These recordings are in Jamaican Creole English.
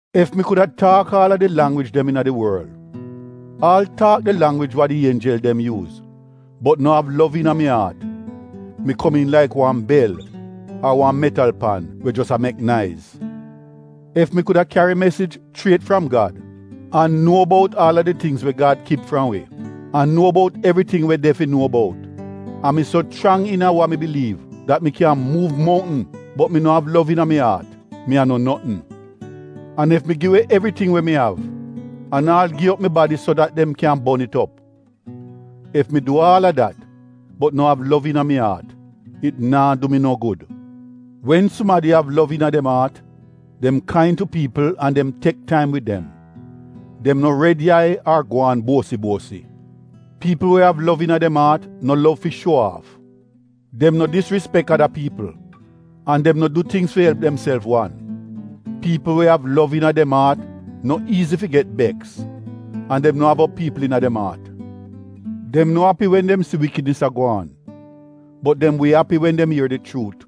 Ef mi kuda taak aal a di langwij dem iina di worl, aal taak di langwij wa di ienjel dem yuuz bot no av lov iina mi aat, mi komiin laik wan bel ar wan metal pan we jos a mek naiz. Ef wi kuda kyari mesij chriet fram Gad, an nuo bout aal a di tingz we Gad kip fram wi an nuo bout evriting we de fi nuo bout, an mi so chrang iina wa mi biliiv dat mi kyan muuv mountn bot mi no av lov iina mi aat, mi a no notn. An ef mi gi we evriting we mi av, an aal gi op mi badi so dat dem kyan bon it op, ef mi du aal a dat bot no av lov iina mi aat, it naa du mi no gud. Wen sumadi av lov iina dem aat, dem kain tu piipl an dem tek taim wid dem. Dem no red yai ar gwaan buosi-buosi. Piipl we av lov iina dem aat no lov fi shuo aaf. Dem no disrispek ada piipl an dem no du tingz fi elp demself wan. Piipl we av lov iina dem aat no iizi fi get beks an dem no av op piipl iina dem aat. Dem no selibriet wen dem si iivl tingz a gwaan, bot dem wi selibriet wen dem ier di chuut.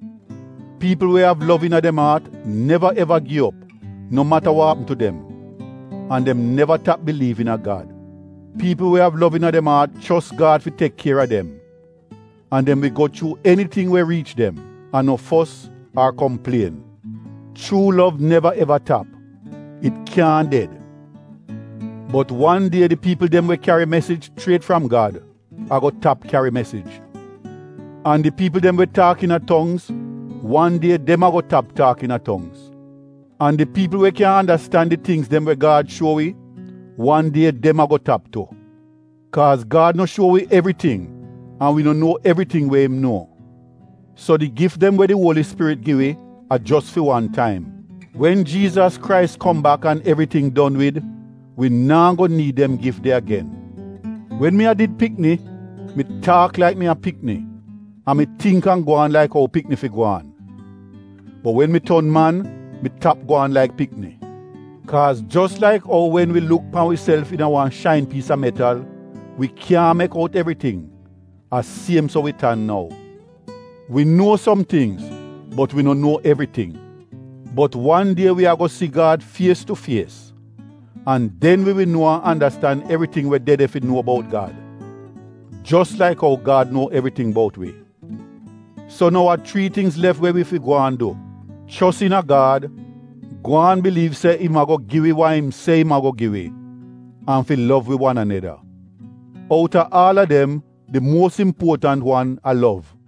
Piipl we av lov iina dem aat neva eva gi op no mata wa apm tu dem an dem neva tap biliiv iina Gad. Piipl we av lov iina dem aat chos Gad fi tek kier a dem an dem wi go chuu eniting we riich dem an no fos ar komplien. Chuu lov neva eva tap — it kyaahn ded. Bot wan die di piipl dem we kyari mesij chriet fram Gad, ago tap kyari mesij. An di piipl dem we taak iina tongz, wan die dem ago tap taak iina tongz. An di piipl we kyan andastan di tingz dem we Gad shuo wi, wan die dem ago tap tu. Kaaz Gad no shuo wi evriting an wi no nuo evriting we im nuo. So di gif dem we di Uoli Spirit gi wi a jos fi wan taim, wen Jiizas Krais kom bak an evriting don wid, wi naa go niid dem gif de agen. Wen mi a did pikni, mi taak laik mi a pikni an mi tingk an gwaan laik ou pikni fi gwaan. Bot wen mi ton man mi tap gwaan laik pikni. Kaaz jos laik ou wen wi luk pan wiself iina wan shain piis a metal, wi kyaahn mek out evriting, a siem so wi tan nou. Wi nuo som tingz bot wi no nuo evriting. Bot wan die wi ago si Gad fies tu fies an den wi wi nuo an andastan evriting we de de fi nuo bout Gad. Jos laik ou Gad nuo evriting bout wi. So nou a chrii tingz lef we wi fi gwaan du: chos iina Gad, gwaan biliiv se im ago gi wi wa im se im ago gi wi an fi lov wi wan aneda. Outa aal a dem di muos impuotant wan a lov.